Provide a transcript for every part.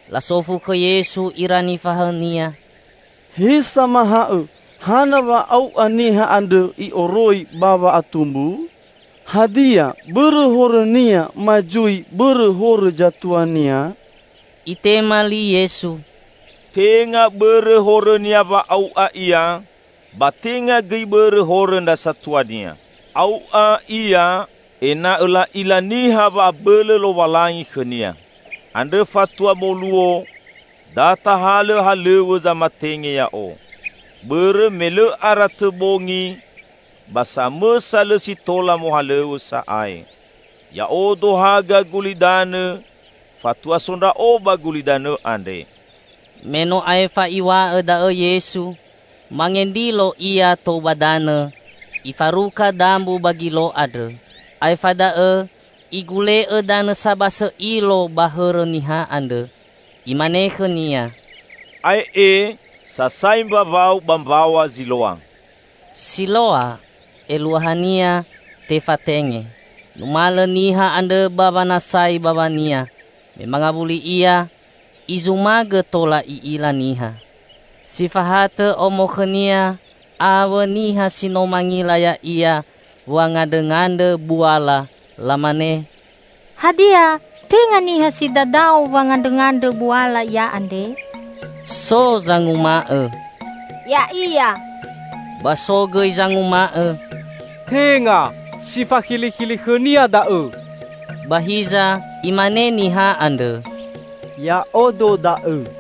Lasofu khõ Yesu ira nifahaõ-Nia, "He Samahaõ, hana wa au'a niha andrõ i'oroi ba wa'atumbu? Hadia, bõrõ horõnia ma zui bõrõ horõ zatuania?" Itema li Yesu, "Tenga bõrõ horõnia wa au'a ia ba tenga gõi bõrõ horõ ndra satuania. Au'a ia ena'õ la'ila niha wa'abõlõ Lowalangi khõnia. Andrõ fatua moluo, da tahalõ halõw̃õ zamatenge Ya'o. Bõrõ me lõ ara tõ bongi, ba samõsa lõ si tola mohalõw̃õ sa'ae. Ya'odo haga gulidanõ fatua so Ndra'o ba gulidanõ andre." Me no aefa Iw̃a'õ da'õ Yesu, mangendrilo Ia tou ba danõ Ifaruka dambu ba gilo andrõ. Aefa da'õ Igule'õ danõ sabasõ ilo ba hõrõ niha andrõ, Imane khõnia, "Ae'e, sasai mbawau ba mbaw̃a Ziloa." (Siloa eluahania 'Tefatenge'.) Numalõ niha andrõ ba wanasai bawania. Me mangawuli ia, izumagõ tola i'ila niha. Si fahatõ omo khõnia awõ niha si no mangila ya'ia wangandrõngandrõ buala, lamane, "Hadia tenga niha si dadao wangandrõngandrõ buala ia andre?" So zanguma'õ, "Ya'ia." Ba so gõi zanguma'õ, "Tenga, si fakhilikhili khõnia da'õ." Ba hiza imane niha andrõ, "Ya'odo da'õ."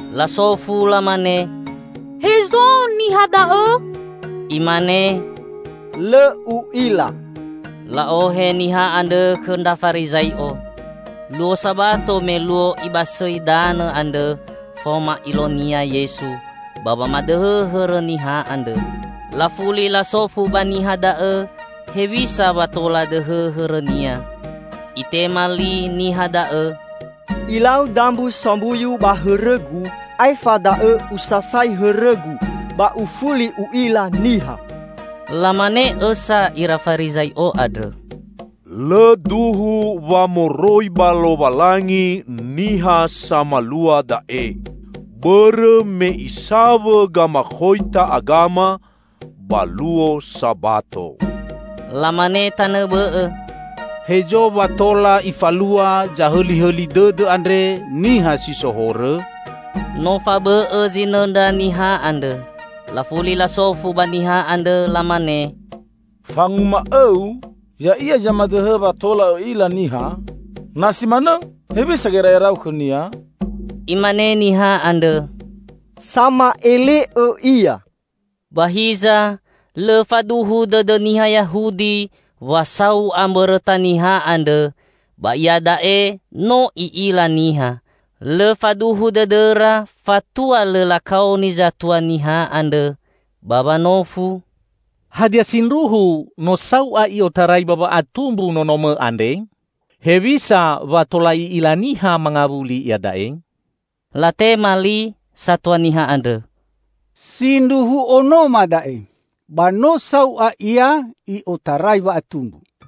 Lasofu lamane, "Hezo niha da'õ?" Imane, "Lõ u'ila." La'ohe niha andrõ khõ ndra Farizai'o. Luo Sabato me luo Ibasõi danõ andrõ faoma ilo-Nia Yesu ba wamadõhõ hõrõ niha andrõ. Lafuli lasofu ba niha da'õ hewisa wa tola dõhõ hõrõnia. Itema li niha da'õ, "Ilau dambu sombuyu ba hõrõgu, aefa da'õ usasai hõrõgu, ba ufuli u'ila niha." Lamane õsa ira Farizai'o andrõ, "Lõ duhu wa moroi ba Lowalangi niha samalua da'e, bõrõ me Isawõ gamakhoita agama ba luo Sabato." Lamane tanõ bõ'õ, "Hezo wa tola Ifalua zahõlihõli dõdõ andre, niha si so horõ?" No fabõ'õ zinõndra niha andrõ. Lafuli lasofu ba niha andrõ, lamane, "Fanguma'õu, Ya'ia zamadõhõ wa tola õ'ila niha? Na si manõ hewisa gera'erau khõ-Nia?" Imane niha andrõ, "Sama'ele'õ Ia." Ba hiza lõ faduhu dõdõ niha Yahudi wa sau'a mbõrõta niha andrõ ba iada'e no i'ila niha. Lõ faduhu dõdõra fatua lõ lakaoni zatua niha andrõ, ba wanofu, "Hadia sindruhu no sau'a i'otarai ba wa'atumbu nonomõ andre? Hewisa wa tola i'ila niha mangawuli iada'e?" Latema li satua niha andrõ, "Sindruhu onoma da'e; ba no sau'a ia i'otarai wa'atumbu.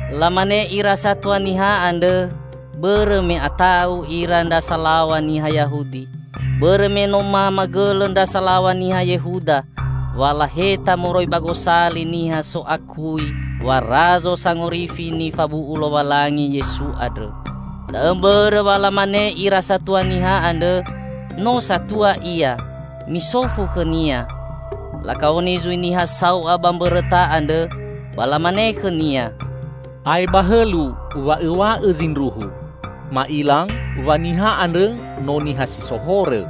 Lamanõ ira satua niha andrõ bõrõ me ata'u ira ndra salaw̃a niha Yahudi; bõrõ me no mamagõlõ ndra salaw̃a niha Yehuda, wa laheta moroi ba gosali niha so'akui wa Razo Sangorifi nifabu'u Lowalangi Yesu andrõ. Da'õ mbõrõ wa lamane ira satua niha andrõ, "No satua ia; misofu khõnia." Lakaoni zui niha sau'a ba mbõrõta andrõ, ba lamane khõnia, "Ae ba hõlu wa õw̃a'õ zindruhu. Ma'ila wa niha andrõ no niha si so horõ."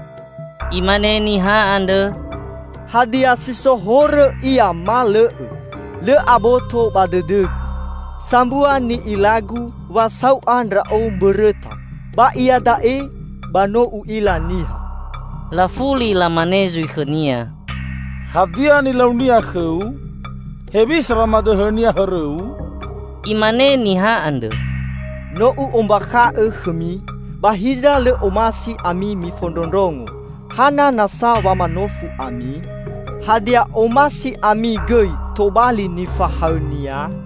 Imane niha andrõ, "Hadia si so horõ ia ma lõ'õ, lõ aboto ba dõdõgu. Sambua ni'ilagu; wa sau'a ndra'o mbõrõta, ba iada'e ba no u'ila niha." Lafuli lamane zui khõnia, "Hadia nilau-Nia khõu? Hewisa wamadõhõ-Nia hõrõu?" Imane niha andrõ, "No u'ombakha'õ khõmi, ba hiza lõ omasi ami mifondrondrongo. Hana nasa wa manofu ami? Hadia omasi ami gõi tobali nifahaõ-Nia?"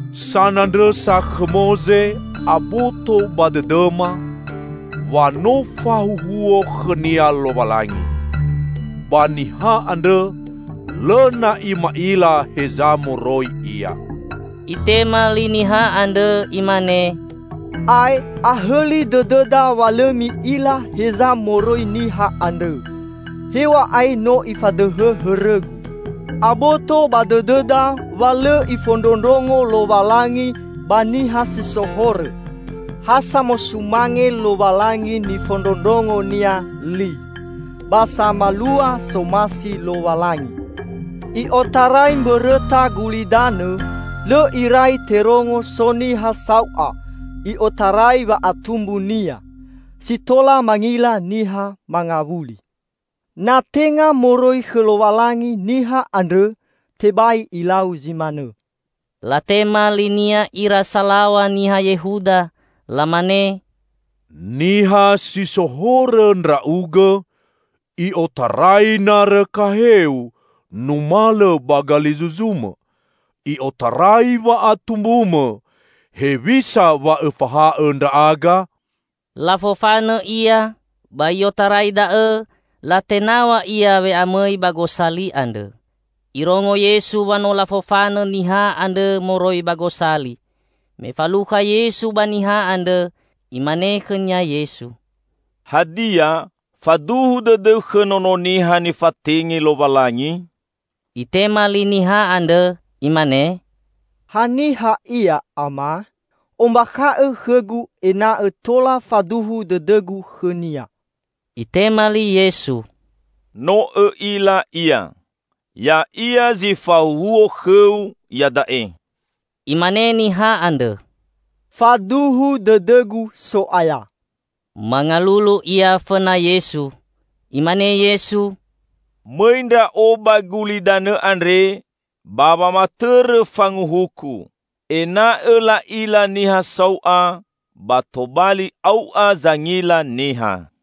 Sanandrõsa khõ Moze aboto ba dõdõma wa no fahuhuo khõnia Lowalangi. Ba niha andrõ, lõ na'i ma'ila heza moroi Ia." Itema li niha andrõ imane, "Ae, ahõli dõdõda wa lõ mi'ila heza moroi niha andrõ, hew̃a'ae no Ifadõhõ hõrõgu. Aboto ba dõdõda wa lõ ifondrondrongo Lowalangi ba niha si so horõ. Ha samosumange Lowalangi nifondrondrongonia li, ba samalua somasi Lowalangi. I'otarai mbõrõta gulidanõ, lõ irai terongo so niha sau'a i'otarai wa'atumbunia, si tola mangila niha mangawuli. Na tenga moroi khõ Lowalangi niha andrõ, tebai Ilau zi manõ." Latema linia ira salaw̃a niha Yehuda, lamane, "Niha si so horõ ndra'ugõ i'otarai narõ gaheu numalõ ba galizuzumõ, i'otarai wa'atumbumõ, hewisa wa'õfahaõ ndra'aga?" Lafofanõ ia ba i'otarai da'õ latenaw̃a ia we'amõi ba gosali andrõ. Irongo Yesu wa no lafofanõ niha andrõ moroi ba gosali. Me falukha Yesu ba niha andrõ, Imane khõnia Yesu, "Hadia, faduhu dõdõu khõ Nono Niha nifatenge Lowalangi?" Itema li niha andrõ, imane, "Ha niha Ia, Ama? Ombakha'õ khõgu ena'õ tola faduhu dõdõgu khõ-Nia!" Itema li Yesu, "No õ'ila Ia. Ya'ia zi fahuhuo khõu iada'e." Imane niha andrõ, "Faduhu dõdõgu, So'aya." Mangalulu ia fõna Yesu. Imane Yesu, "Mõi Ndra'o ba gulidanõ andre ba wamatõrõ fanguhuku; ena'õ la'ila niha sau'a, ba tobali au'a zangila niha."